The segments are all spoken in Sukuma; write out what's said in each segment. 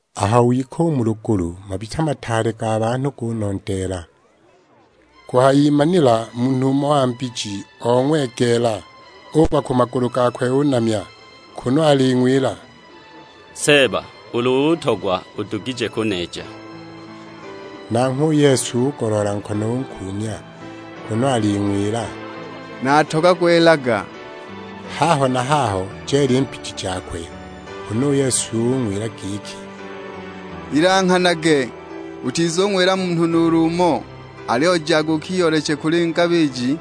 Aho wika u mu lugulu, mabita mataale ga banhu gunondeela. Kuhayimanila munhu umo wa mbiji ong'wegeela, ugwa ku magulu gakwe unamya, kunu aling'wila; "Seeba, ulu utogwa udugije kuneeja." Nanghwe u Yesu ugoloola nkono unkuumya, kunu aling'wila; "Natogagwa elaga!" Haho na haho jeela i mbiji jakwe. Huna u Yesu ung'wila giki, "Ilanghanage, utizuwila munhu nuulu umo, aliyo jaga ukiyooleche kuli ngabiji,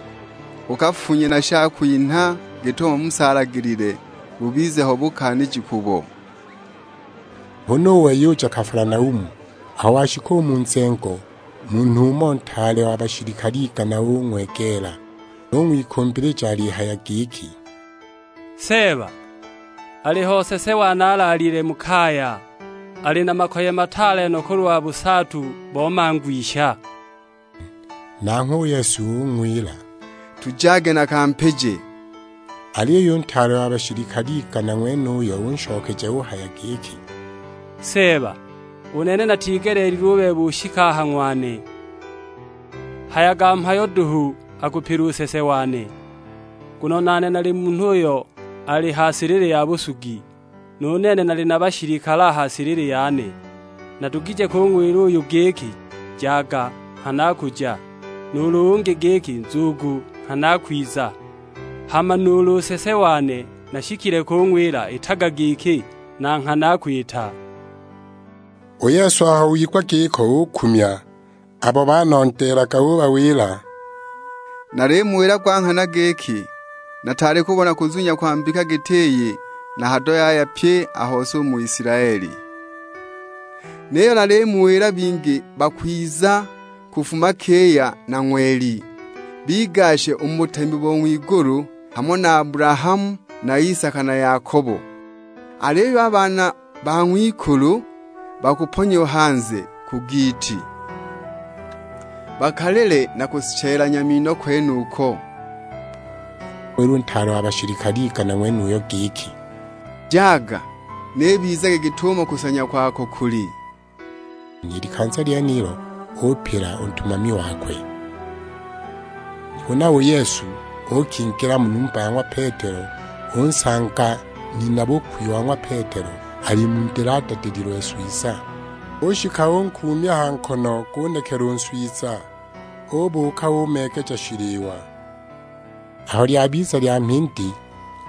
ukafunye na shakwinha git'umo Musa alagilile; bubize ho bukaaniji kubo." Huna u wei uja Kafalanaumu, aho washika u mu nzengo, munhu umo, ntaale wa bashilikale igana ung'wegeela. Ung'wikumbilija alihaya giki, "Seeba, aliho nsese wane alaalile mu kaya, ali na makoye mataale no kulwa busaatu bo mangwisha!" Nanghwe u Yesu ung'wila, "Tujage nakampije." Aliyo u ntaale wa bashilikale igana ng'wenuyo, unshokeja uhaya giki; "Seeba, u nene natigeleelilwe u bebe ushike a ha ng'wane, hayaga mhayo duhu, akupila u nsese wane. Nguno nane nali munhu uyo ali ha silili ya busugi; nu nene nali na bashilikale a ha silili yane. Nadugije kung'wila uyu giki, 'Jaga;' nghana akuja. Nuulu ungi giki, 'Nzugu;' nghana akwiza. Hama nuulu nsese wane nashikile kung'wila, 'Itaga giki;' na nghana akwita!" U Yesu aho wigwa giko ukumya, abo banondeelaga ubawila, "Nalimuwila gwa nghana giki, nataali kubona kuzunya kwa mbika giti iyi na hado yaya pye a hose u mu Isilaeli. Niyo nalimuwila bingi bakwiza, kufuma kiya na ng'weli, bigashe u mu butemi bo ng'wigulu hamo na Abulahamu na Isaka na Yakobo. Aliyo a baana ba ng'wikulu bakuponyiwa hanze ku giiti, bakalile na kushelanya mino kwenuko!" Huna u Yesu ung'wila u ntaale wa bashilikale igana ng'wenuyo giki; "Jaga, n'ibizage git'umo kusanya kwako kuli." I likanza lyenilo upila u ntumami wakwe. Huna u Yesu uukingila mu numba ya ng'wa Petelo, unsanga nina-bukwi wa ng'wa Petelo ali mu ndili adadililwe nswiza. Ushika unkuumya ha nkono gunekela u nswiza, ubuuka umeegeja shiliwa. Aho lyabiza lya mhindi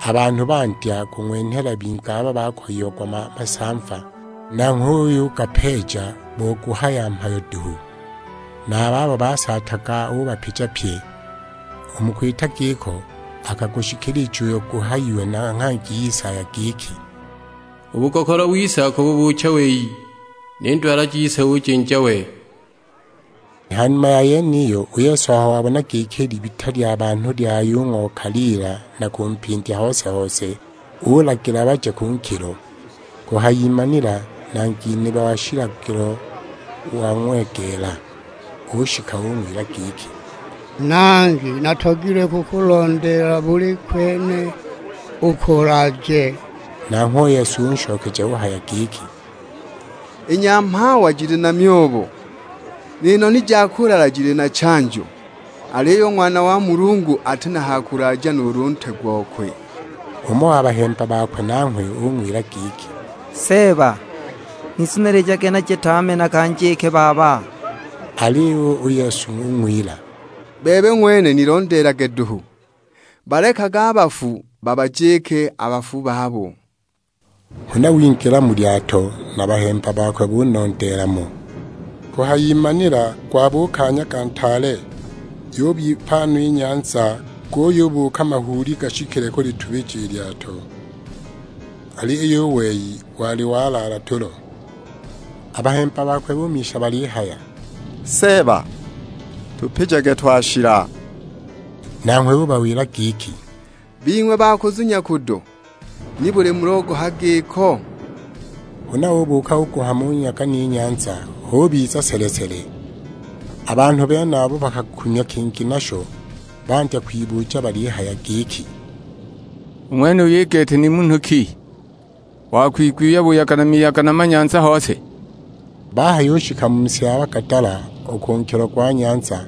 a banhu bandya kung'wenhela bingi abo bakoyiagwa masamva, nanghwe uyugapeeja bo guhaya mhayo duhu; na a babo basaataga ubapija pye. U mu kwita giko akagushikilija uyo guhayiwe na nghangi Isaya giki, "U bugokolo wise akabubuucha wei; ni ndwala jise ujinja we." Ha numa ya yeniyo u Yesu aho wabona giki i libita lya banhu lyayung'okaliila na kumpindya hose-hose, ulagila baje ku nkilo. Kuhayimanila nangi nebe wa shilagilo wang'wegeela; ushika ung'wila giki, "Nangi natogilwe kukulondeela buli kwene uko ulaaje." Nanghwe u Yesu unshokeja uhaya giki, "I nyamhawa jili na myobo, ni noni ja kulala jili na chanjo; aliyo u Ng'wana wa Munhu ati na ha kulaaja nuulu ntwe gokwe!" Umo wa bahemba bakwe nanghwe ung'wila giki, "Seeba, nizunilijage naje tame nakanjike baba." Aliyo u Yesu ung'wila, "Bebe ng'wene nilondeelage duhu, balekage a bafu babajike a bafu babo." Huna wingila mu lyato, na a bahemba bakwe bunondeela mo. Kuhayimanila gwabuuka nyaga ntaale, yubipa no i nyanza, guyubuuka mahuuli gashikile kulitubija i lyato. Aliyo u wei wali walaala tulo. A bahemba bakwe bumisha balihaya; "Seeba tupijage twashila!" Nanghwe ubawila giki, "Bing'we ba kuzunya kudo, nibuli mulogoha giko?" Huna ubuuka uguhama u nyaga ni nyanza, hubiza sele-sele! A banhu benabo bakakumya kingi nasho, bandya kwibuja balihaya giki, "U ng'wenuyu i gete ni munhu ki, wakwigwiwa buyaga na miyaga na manyanza hose?" Bahayushika mu si ya Bagadala u ku nkilo gwa nyanza,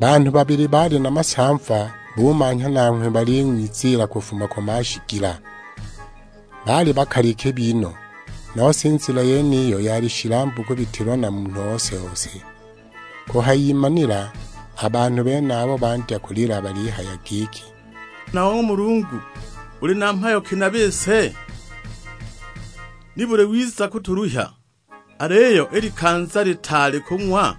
banhu babili baali na masamva bumanhya nanghwe baling'wiziila kufuma ku mashigila. Baali bakali kibi no; nose i nzila yeniyo yali shilambu kubitilwa na munhu ose-ose. Kuhayimanila a banhu benabo bandya kulila balihaya giki, "Ng'wana wa ng'wa Mulungu uli na mhayo ki na a bise? Nibuli wiza kutuluhya, aliyo i likanza litaali u kung'wa?"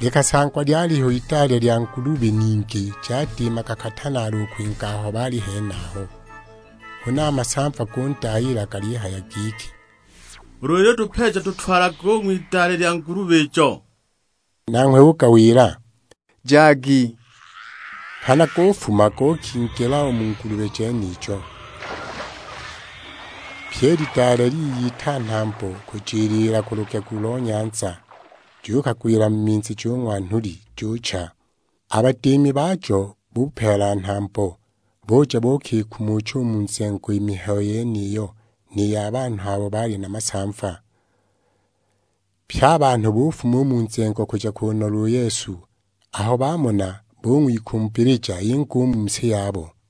Likasangwa lyaliho idale lya ngulubi ningi jadiimaga katanaalo u kwinga aho baali henaho. Huna a masamva gundayiila galihaya giki, "Ulu ulitupeeja tutwalage u ng'widale lya ngulubi ijo." Nanghwe ugawila, "Jagi." Nghana gufuma gukingila u mu ngulubi jenijo. Pyi i lidale liyita nhambo kujiliila ku lugegu lo nyanza, jukagwila mu minzi jung'wa nhuli, jucha! A badiimi bajo bupeela nhambo, buja buukikumucha u mu nzengo i mihayo yeniyo, ni ya banhu abo baali na masamva. Pye a banhu bufuma u mu nzengo kuja kunola u Yesu; aho bamona bung'wikumbilija inge u mu si yabo!